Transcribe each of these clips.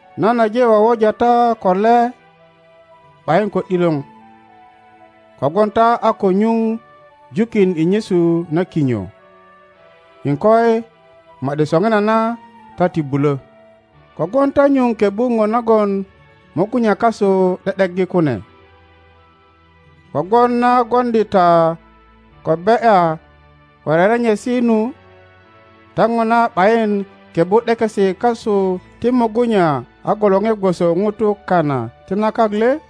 Nan aje wowoja ta ko le ’bayin ko ’dilor, kogwon ta a ko nyuŋ jukin i nyesu na kinyo;iŋkoi, ma ’di soŋinana ta ti bulö, 3kogwon ta nyuŋ kebbu ŋo nagon mugunya kasu ’de ’deggi kune. Kogwon na gwoŋdi ta ko be ’ya ko rerenyesi nu, ta ŋona ’bayin kebbu ’dekesi kasu ti mugunya a gwolore gwoso Ŋutu kana ti na kak le?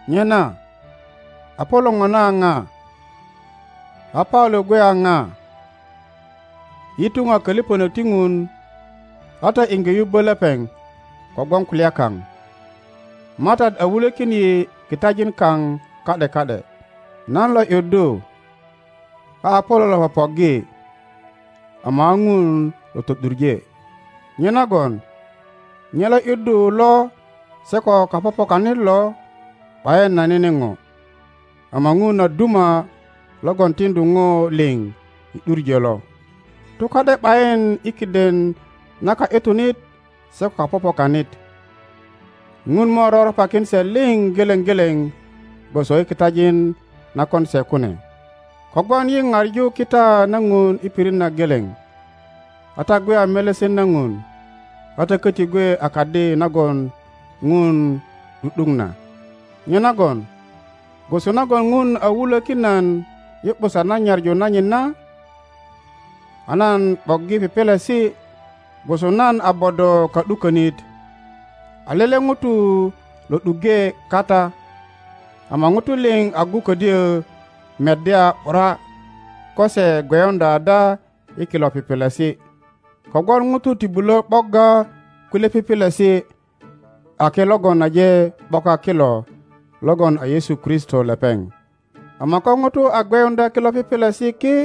Nyena Apolo ŋona a ŋa? A Paulo gwe a pa? Yi tuŋ a kolipönök ti Ŋun a ta iŋge yubbo lepeŋ kogwon kulya kaŋ. Matat a wulökin yi kitajin kaŋ ka ’de ka ’de. Nan lo ’yuddu, a Apolo lo popoggi, ama a Ŋun lo to ’duŋe. Nyenagon nye lo ’yuddu lo se ko kapopokanit lo ’bayin a nene go, ama Ŋun a duma logon tiŋdu ŋo liŋ i ’duŋö lo. Tuka ’de ’bayin i kiden na ka ’yutunit se ko kapopokanit; Ŋun mo roropakin se liŋ geleŋ geleŋ gwoso i kitajin na kon se kune. Kogwon yi paŋu kita na Ŋun i pirit na geleŋ, a ta gwe a melesen na Ŋun. A ta koti gwe a kadi nagon Ŋun ’du ’duk na. Nyenagon gwoso nagon Ŋun a wulökin nan i ’busan na nyaŋu nanyit na, a nan ’boggi pipilisi gwoso nan a bodo ka ’dukonit, a lele ŋuro lo ’duŋge kata, ama Ŋutu liŋ agu ködyö meddya ’bura ko se gweyuŋdya ada i kilo pipilisi. Kogwon Ŋutu ti bulo ’bogga kulye pipilisi ake logon aje ’boka kilo logon a Yesu Kristo lepeŋ. Ama ko ŋuto a gweyuŋdya kilo pipilisi ki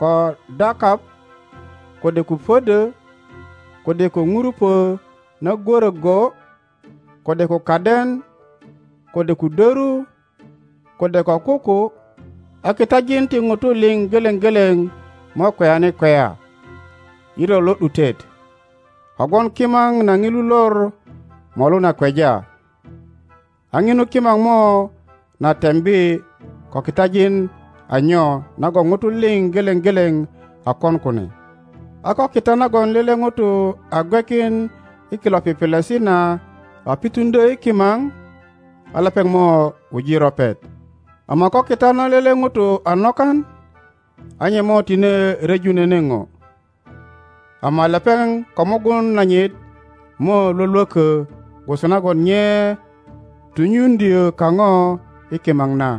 ko dakap, kode ko podo. kode ko ŋurupö na gwöro go, kode ko kaden, kode ko doru, kode ko kuku, a kitajin ti Ŋutu liŋ geleŋ geleŋ mo kweyani kweya i lor lo ’dutet. Kogwon kimaŋ na Ŋilu lor molu na kweja, a ŋinu kimao mo na tembi ko kitajin a nyo nagon Ŋutu liŋ geleŋ geleŋ a kon kune. A ko kita nagon lele ŋuto a gwekin i kilo pipilisi na a pituŋdyö i kimaŋ, a lepeŋ mo wuji ropet. Ama ko kita na lele ŋuto a nokan, a nye mo tine ryeju nene ŋo, ama lepeŋ ko mugun nanyit mo lwolwoko gwoso nagon nye tunyuŋdyo kaŋo i kimaŋ na.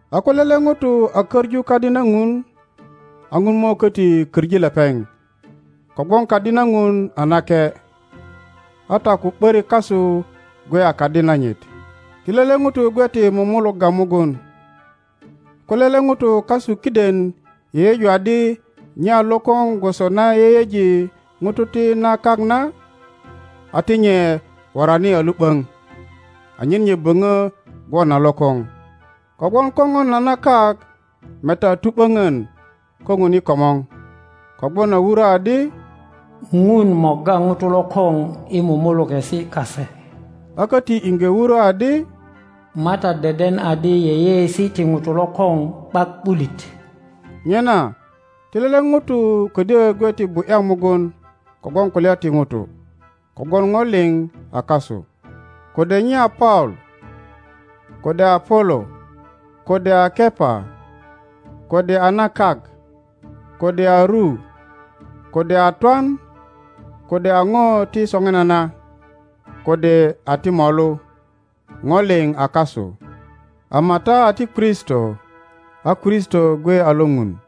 A ko lele Ŋuto a koŋu kadi na Ŋun, a Ŋun mo köti koŋi lepeŋ. Kogwon kadi na Ŋun a nake, a ta ko ’börik kasu gwe a kadi nanyit. Ti lele ŋuto gwe ti mumulugga mugun. Ko lele ŋuto kasu kiden yeyeju adi nye a lokoŋ gwoso na yeyeji ŋutu ti na kak na, a ti nye worani a lu ’boŋ anyen nye boŋo gwon a lokoŋ. Kogwon kopon na na kak meta a tu ’boŋon ko Ŋun i komor. Kogwon a wuro adi, Ŋun morga ŋutu lokoŋ i mumulukesi kase, a koti iŋge wuro adi, Matat deden adi yeyeesi ti ŋutu lokoŋ ’bak ’bulit. Nyena ti lele ŋuto ködyö gwe ti bu ’ya mugun kogwon kulya ti Ŋutu. Kogwon ŋo liŋ a kasu, kode nye a Paulo, kode a Apolo, kode a Kepa, kode a na kak, kode a ru, kode a twan, kode a ŋo ti soŋinana, kode a ti molu, ŋo liŋ a kasu. Ama ta a ti Kristo, a Kristo gwe a lo Ŋun.